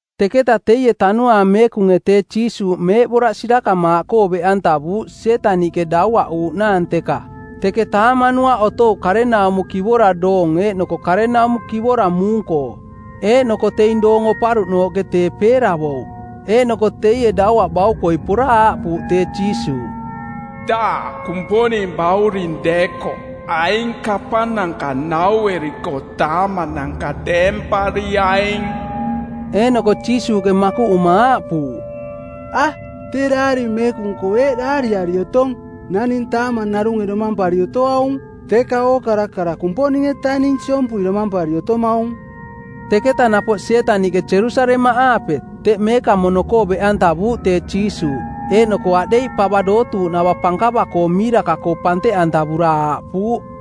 Teketa teie Tanuaang Meekunge tee Jiisuuꞌ meeꞌboraꞌ sirakamaaꞌkoo beꞌantavuuꞌ Sietaniꞌke dauaꞌuuꞌnaang teka. Teke taamanuaꞌ otouꞌ karenaumo kivora doong eeꞌnoko karenaumo kivora muung-koo. Eeꞌnoko teing doong oparuꞌnooꞌke tee peeravouꞌ. Eeꞌnoko teie dauaꞌbaukoi pora aaꞌpuuꞌ tee Jiisuuꞌ, “Daꞌ Kumponing Bauring deekoꞌ aing kapananka naueriko taamananka deempariaing.” Eeꞌnoko Jiisuuꞌke makuꞌuma aaꞌpuuꞌ, “A, tee Daari Meekung-koo eeꞌ daariari otong, ‘Naning taamang narunge domampari otoaung, teka ookara kara Kumponing-etaning siompui domampari otomaung.’” Teketa napoꞌ Sietaniꞌke Jerusalemaꞌaape, teꞌ Meekamono-koo beꞌantavuuꞌ tee Jiisuuꞌ, eeꞌnoko aꞌdeiꞌ pava dootuuꞌnava pankava-koo miiraka-koo panteꞌantavura aaꞌpuuꞌ,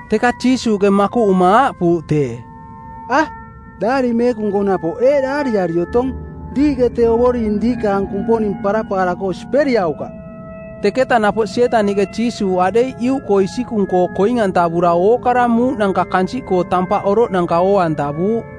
Teka Jiisuuꞌke makuꞌuma aaꞌpuuꞌ tee, “A, Daari Meekung-koo napoꞌ eeꞌ daariari otong, ‘Diiꞌke tee Ovoring diikaang Kumponing parapaara-koo siperiaukaꞌ.’” Teketa napoꞌ Sietaniꞌke Jiisuuꞌ aꞌdeiꞌ iuꞌkoo isikung-koo koing-antavura ookara muuꞌnanka kansiꞌkoo tampaꞌ oroꞌnanka oo-antavuuꞌ.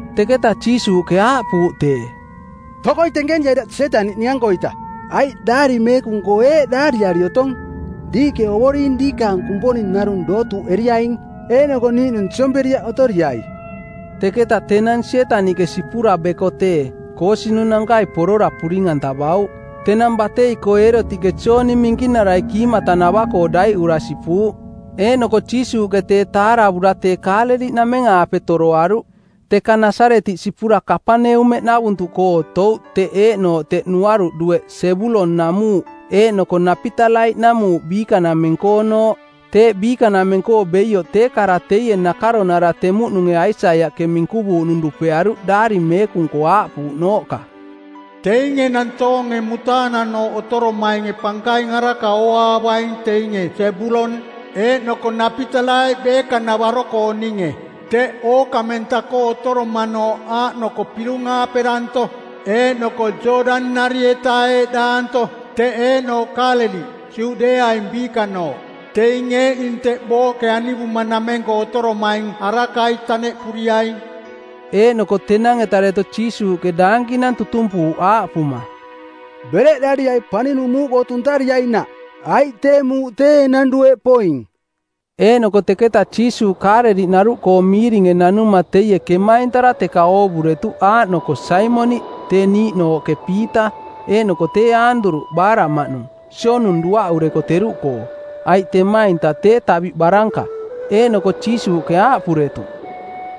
Teketa Jiisuuꞌke aaꞌpuuꞌ tee, “Tokoi tenkeniai daꞌ Sietaniꞌ ning-ankoita, aiꞌ Daari Meekung-koo eeꞌ daariari otong, ‘Diiꞌke Ovoring diikaang Kumponing narung dootuuꞌeriaing, eeꞌnoko niiꞌnung siomperiaꞌ otoriai.’” Teketa tenang Sietaniꞌke sipura beko tee, koosinunankai porora puring-antavauꞌ. Tenang batei-koo Eerotiꞌke Jooni Minkinarai kiimatanava-koo daiꞌura sipuuꞌ. Eeꞌnoko Jiisuuꞌke tee taaravura tee Kaaleliꞌnameng-aape toroaruꞌ. Teka Nasaretiꞌ sipura Kapaneumeꞌnavuntuꞌkoo otouꞌ teꞌ eeꞌnooꞌ teꞌ nuaruꞌ dueꞌ Sebulon-namuuꞌ eeꞌnoko Napitalai-namuuꞌ biikanameng-koonooꞌ. Teeꞌ biikanameng-koo beioꞌ tee kara teie nakaronara temuꞌnunge Aisaiaꞌke minkuvuuꞌnung dupearuꞌ Daari Meekung-koo aaꞌpuuꞌnooꞌka, “Teinge nantoonge mutaananooꞌ otoromainge pankaing araka ooaavaing teinge Sebulon eeꞌnoko Napitalai beekanavaro-kooninge, teꞌ ookamenta-koo otoromanooꞌ aaꞌnoko pirung-aape danto eeꞌnoko Jooꞌdani-nari-eta eeꞌdaanto, teꞌ eeꞌnooꞌ Kaaleliꞌ, Juꞌdeeaing Biikanooꞌ. Teing eeꞌning teꞌ booꞌke anivumanameng-koo otoromaing arakai taneꞌpuriaing.” Eeꞌnoko tenang-eta deto Jiisuuꞌke daankinang tutumpuuꞌ aaꞌpuma, “Bereꞌdariai paninung muuꞌkoo tuntariainaꞌ, aiꞌ tee muuꞌ tee enang dueꞌ poing.” Eeꞌnoko teketa Jiisuuꞌ Kaaleliꞌnaruꞌkoo miiringe nanuma teie kemaintara teka oovuretuꞌ aaꞌnoko Saimoniꞌ tee niiꞌnooꞌke Piita, eeꞌnoko tee Aanduruꞌ, baaraꞌmaꞌnung, sionung duaꞌureko teruꞌkoo, aiꞌ temainta tee taviꞌ baranka. Eeꞌnoko Jiisuuꞌke aaꞌpuretuꞌ,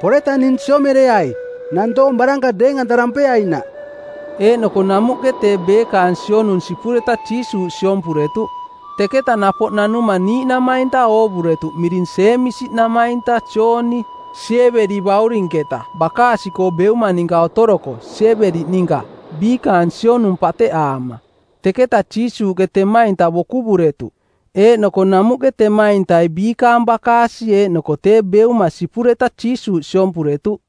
“Poreta ning siomereai, nantoong baranka deeng-antarampeainaꞌ.” Eeꞌnoko namuꞌke tee beekaang sionung sipureta Jiisuuꞌ siompuretuꞌ. Teketa napoꞌ nanuma niiꞌnamainta oovuretuꞌ miring Jeemisi namainta Jooni, Siebedi baurinketa, bakaasi-koo beuma ninka otoroko, Siebedi ninka, biikaang sionung pateꞌaama. Teketa Jiisuuꞌke temainta bokuvuretuꞌ. Eeꞌnoko namuꞌke temaintai biikaang bakaasi eeꞌnoko tee beuma sipureta Jiisuuꞌ siompuretuꞌ.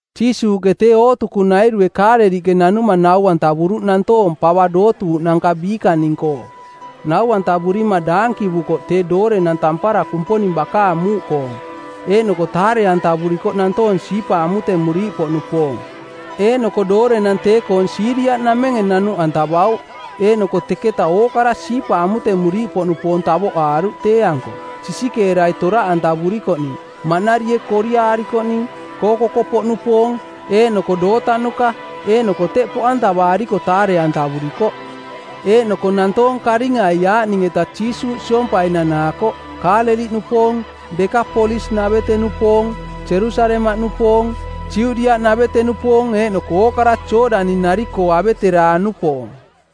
Jiisuuꞌke tee ootukunairue Kaaleliꞌke nanuma nau-antavuruꞌ nantoong pava dootuuꞌnanka biikaning-koo. Nau-antavurima daankivukoꞌ tee doorenang tampara Kumponing bakaang muuꞌkoong, eeꞌnoko taare-antavurikoꞌ nantoong siipa amutemuriiꞌpoꞌnupoong. Eeꞌnoko doorenang tee-koong Siiria-namenge nanuꞌantavauꞌ, eeꞌnoko teketa ookara siipa amutemuriiꞌpoꞌnupoong tavoꞌaaruꞌ tee-anko, sisikeerai toraꞌantavurikoꞌning, maꞌnarie koriaarikoꞌning, kookoko˜poꞌnupoong, eeꞌnoko dootanuka, eeꞌnoko teꞌ poꞌantavaariko taare-antavurikoꞌ. Eeꞌnoko nantoong karingai aaꞌning-eta Jiisuuꞌ siompai nanaakoꞌ, Kaaleliꞌnupoong, Dekapolis-navete-nupoong, Jerusalemaꞌnupoong, Judiaꞌnavete-nupoong, eeꞌnoko ookara Jooꞌdani-nari-koo aveteraang-nupoong.